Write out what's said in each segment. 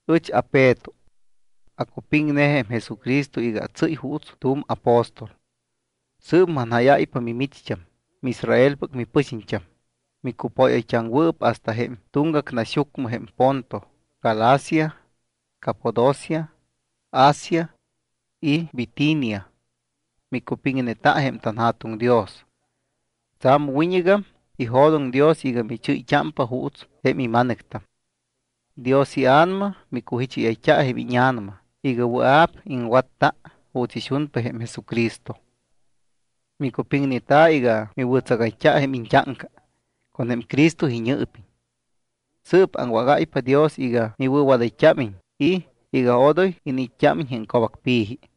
Ɨch aPeto. Acupiŋne jém Jesucristo iga atsɨ́y juuts tu̱m apóstol. Sɨɨp manjáyáypa mimicht́am miIsraelpɨc mipɨxiñt́am, micupóyayt́aŋwɨɨp hasta jém tuŋgac naxyucmɨ jém Ponto, Galacia, Capadocia, Asia y Bitinia. Micupiŋneta jém tanJa̱tuŋ Dios. Tsa̱m wiñɨgam ijo̱doŋ Dios iga michɨ́yt́ámpa juuts jém ima̱nɨctam. Dios iA̱nama micujicháyayt́a jém íña̱nama iga wɨa̱p iŋwatta juuts ixunpa jém Jesucristo. Micupiŋneta iga miwɨ̱tsagayt́a jém iñt́áŋca con jém Cristo iñɨɨpiñ. Sɨɨp aŋwágáypa Dios iga miwɨ̱wadayt́ámiñ y iga odoy iniit́t́ámiñ jém co̱bacpi̱ji.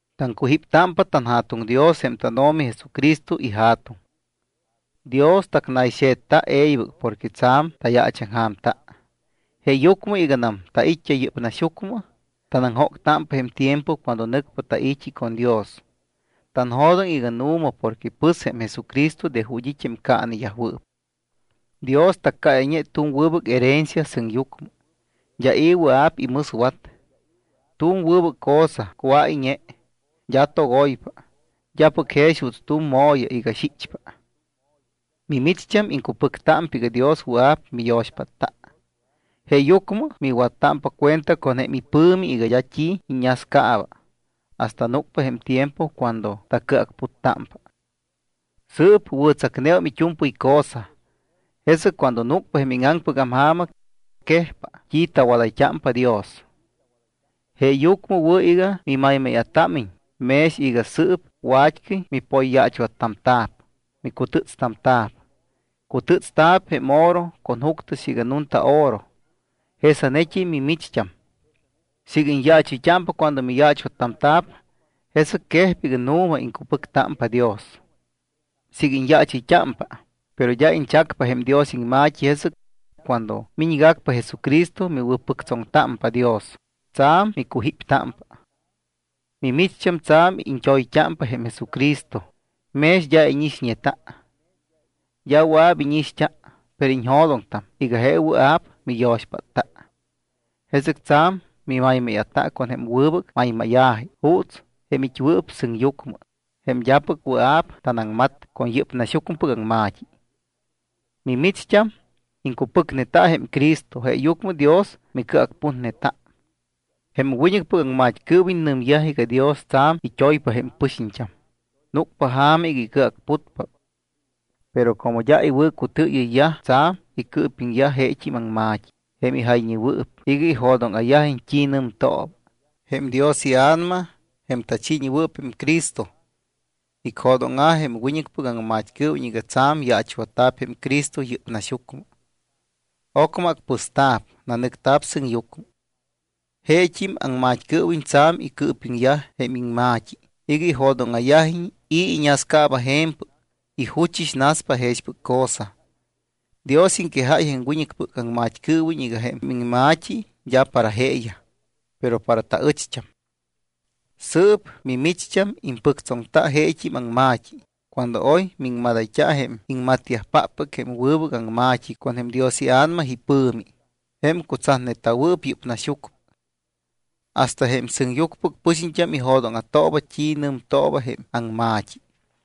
Taŋcujíptámpa tanJa̱tuŋ Dios jém tánO̱mi Jesucristo iJa̱tuŋ. Dios tacnayxe̱tta e̱ybɨc porque tsa̱m tayaachaŋja̱mta. Jeeyucmɨ iganam tait́t́a yɨ́p naxyucmɨ, tanaŋjóctámpa jém tiempo cuando nɨcpa tai̱t́i con Dios. Tanjo̱doŋ iga nu̱ma porque pɨs jém Jesucristo de ju̱t́ it́ jém caaneyajwɨɨp. Dios taccáyayñe tu̱m wɨbɨc herencia sɨŋyucmɨ. D́a i̱ wɨa̱p imɨswat. Tu̱m wɨbɨc cosa cuáyñe, d́a togoypa, d́apɨc jex juuts tu̱m mo̱ya iga xichpa. Mimicht́am iŋcupɨctámpa iga Dios wɨa̱p miyo̱xpátta, jeeyucmɨ miwattámpa cuenta con jém ipɨ̱mi iga d́a t́i iññascaaba hasta núcpa jém tiempo cuando tacɨacputtámpa. Sɨɨp wɨ̱tsacneum it́u̱mpɨy cosa. Jesɨc cuando núcpa jém íŋaŋpɨgam ja̱ma, quejpa t́i tawadayt́ámpa Dios. Jeeyucmɨ wɨ̱ iga mimaymáya̱támiñ mex iga sɨɨp wat́cɨy mipoyyaachwattamta̱p, micutɨ́tstamta̱p. Cutɨ́tsta̱p jém oro con juctɨ siiga nunta oro. Jesanet́im mimicht́am siiga iñyaachɨyt́ámpa cuando miyaachwattamta̱p, jesɨc quejpa iga nu̱ma iŋcupɨctámpa Dios. Siiga iñyaachɨyt́ámpa, pero d́a iñchacpa jém Dios iŋma̱t́i, jesɨc cuando miñgacpa Jesucristo, miwɨ̱pɨctsoŋtámpa Dios, tsa̱m micujíptámpa. Mimicht́am tsa̱m iñt́oyt́ámpa jém Jesucristo mex d́a íñixñeta. D́a wɨa̱p íñixt́a, pero iñjo̱doŋtam iga je wɨa̱p miyo̱xpátta. Jesɨc tsa̱m mimaymáya̱ta con jém wɨbɨc maymáya̱ji juuts jém it́wɨɨp sɨŋyucmɨ, jém d́apɨc wɨa̱p tanaŋmat con yɨ́p naxyucmɨpɨc aŋma̱t́i. Mimicht́am iŋcupɨcneta jém Cristo, jeeyucmɨ Dios micɨacputneta. Jém wiñɨcpɨc aŋmat́cɨɨwiñ nɨmyaj iga Dios tsa̱m it́oypa jém pɨxiñt́am, núcpa ja̱ma iga icɨacputpa. Pero como d́a iwɨ̱cutɨɨyɨyyaj, tsa̱m icɨɨpiŋyaj jeet́im iŋma̱t́i jém ijayñeyajwɨɨp iga ijo̱dóŋa̱yajiñ t́i nɨmtooba. Jém Dios iA̱nama, jém tachiiñewɨɨp jém Cristo, icjo̱dóŋa̱ jém wiñɨcpɨc aŋmat́cɨɨwiñ iga tsa̱m yaachwatta̱p jém Cristo yɨ́p naxyucmɨ. Ocmɨ acpɨsta̱p, nanɨcta̱p sɨŋyucmɨ. Jeet́im aŋmat́cɨɨwiñ tsa̱m icɨɨpiŋyaj jém iŋma̱t́i iga ijo̱dóŋa̱yajiñ i̱ iñascaaba je̱mpɨc y juchɨs naspa jexpɨc cosa. Dios iŋquejáy jém wiñɨcpɨc aŋmat́cɨɨwiñ iga jém iŋma̱t́i d́a para jeeyaj, pero para taɨcht́am. Sɨɨp mimicht́am impɨctsoŋta jeet́im aŋma̱t́i cuando oy miŋmadayt́a jém iŋmatyajpáppɨc jém wɨbɨc aŋma̱t́i con jém Dios iA̱nama ipɨ̱mi, jém cutsatneta̱wɨɨp yɨ́p naxyucmɨ. Hasta jém sɨŋyucmɨpɨc pɨxiñt́am ijo̱dóŋa̱tooba t́i nɨmtooba jém aŋma̱t́i.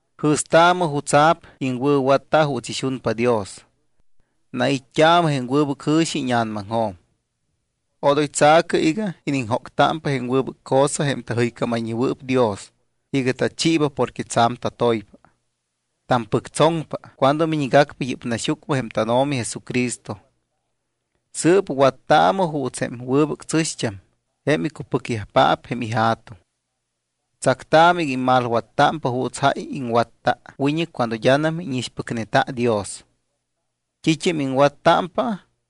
Jɨ̱staamɨ jutsa̱p iŋwɨ̱watta juuts ixunpa Dios. Nait́t́aamɨ jém wɨbɨc jɨ̱xi íña̱namaŋjo̱m. Odoy tsa̱cɨ iga iniŋjóctámpa jém wɨbɨc cosa jém tajɨycámayñewɨɨp Dios iga tachiiba porque tsa̱m tatoypa. Tampɨctsoŋpa cuando miñgacpa yɨ́p naxyucmɨ jém tánO̱mi Jesucristo. Sɨɨp wattaamɨ juuts jém wɨbɨc tsɨ̱xt́am, jém icupɨcyajpaap jém ija̱tuŋ. Tsactaamɨ iga immalwattámpa juuts jáy iŋwatta wiñɨc cuando d́anam íñixpɨcneta Dios. T́it́am iŋwattámpa,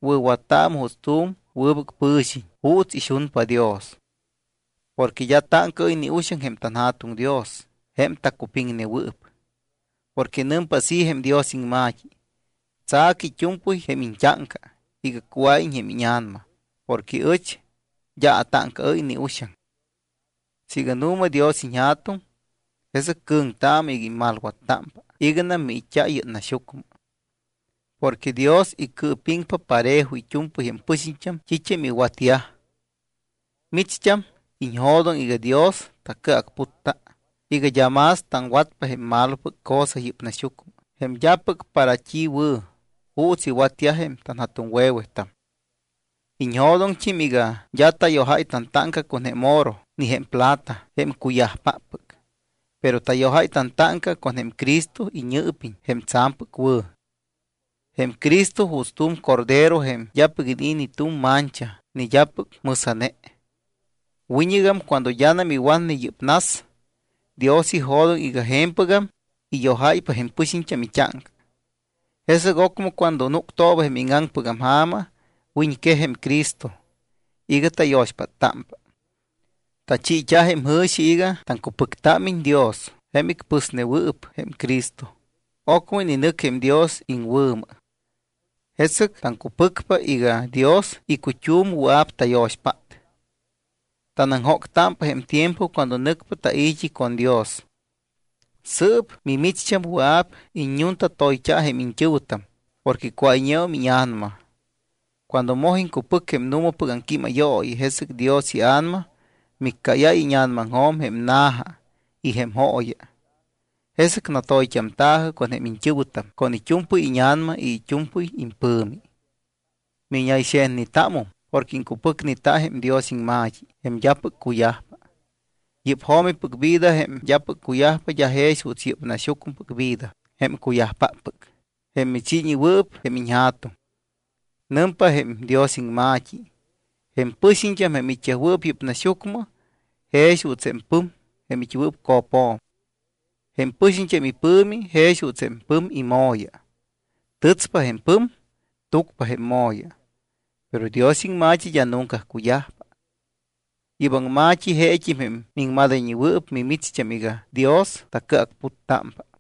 wɨ̱wattaamɨ juuts tu̱m wɨbɨc pɨ̱xiñ juuts ixunpa Dios. Porque d́a táŋcaɨ́y ni uxaŋ jém tanJa̱tuŋ Dios jém tacupiŋnewɨɨp. Porque nɨmpa así jém Dios iŋma̱t́i: “Tsa̱cɨ it́u̱mpɨy jém iñt́áŋca iga cuáyiñ jém íña̱nama porque ɨch d́a atáŋcaɨ́y ni uxaŋ.” Siiga nu̱ma Dios iñJa̱tuŋ, jesɨc cɨ̱ŋtaamɨ iga immalwattámpa iganam miit́t́a yɨ́p naxyucmɨ. Porque Dios icɨɨpiŋpa parejo it́u̱mpɨy jém pɨxiñt́am t́it́am iwatyaj. Micht́am iñjo̱doŋ iga Dios tacɨacputta iga d́a más taŋwatpa jém malopɨc cosa yɨ́p naxyucmɨ, jém d́apɨc para t́i wɨ̱, juuts iwatyaj jém tanja̱tuŋwe̱wetam. Iñjo̱doŋt́im iga d́a tayojáy tantáŋca con jém oro ni jém plata jém cuyajpáppɨc, pero tayojáy tantáŋca con jém Cristo iñɨɨpiñ jém tsa̱mpɨc wɨ̱. Jém Cristo juuts tu̱m cordero jém d́apɨc inii̱ ni tu̱m mancha ni d́apɨc mɨsa̱ne. Wiñɨgam cuando d́anam iwatne yɨ́p nas, Dios ijo̱doŋ iga je̱mpɨgam iyojáypa jém pɨxiñt́am it́áŋca. Jesɨc ocmɨ cuando núctooba jém íŋaŋpɨgam ja̱ma, wiñquej jém Cristo iga tayo̱xpáttámpa. Tachiit́a jém jɨ̱xi iga taŋcupɨctámiñ Dios jém icpɨsnewɨɨp jém Cristo, ocmɨ ininɨc jém Dios iŋwɨ̱mɨ. Jesɨc taŋcupɨcpa iga Dios icut́um wɨa̱p tayo̱xpát. Tanaŋjóctámpa jém tiempo cuando nɨcpa tai̱t́i con Dios. Sɨɨp mimicht́am wɨa̱p iññuntatoyt́a jém iñt́ɨ̱wɨtam porque cuáyñeum íña̱nama. Cuando moj iŋcupɨc jém nu̱mapɨc aŋquímayooyi, jesɨc Dios iA̱nama miccáyáy íña̱namaŋjo̱m jém na̱ja y jém jooya. Jesɨc natoyt́amta̱jɨ con jém iñt́ɨ̱wɨtam con it́u̱mpɨy íña̱nama y it́u̱mpɨy impɨ̱mi. Miñayxe̱tnetámum porque iŋcupɨcneta jém Dios iŋma̱t́i jém d́apɨc cuyajpa. Yɨ́p jo̱mipɨc vida, jém d́apɨc cuyajpa, d́a jex juuts yɨ́p naxyucmɨpɨc vida, jém cuyajpáppɨc, jém michiiñewɨɨp jém iñja̱tuŋ. Nɨmpa jém Dios iŋma̱t́i: Jém pɨxiñt́am jém it́yajwɨɨp yɨ́p naxyucmɨ jex juuts jém pɨm jém it́wɨɨp co̱pjo̱m. Jém pɨxiñt́am ipɨ̱mi jex juuts jém pɨm imo̱ya. Tɨtspa jém pɨm, túcpa jém imo̱ya. Pero Dios iŋma̱t́i d́a nunca cuyajpa. Yɨ́p aŋma̱t́i jeet́im jém miŋmadayñeta̱wɨɨp mimicht́am iga Dios tacɨacputtámpa.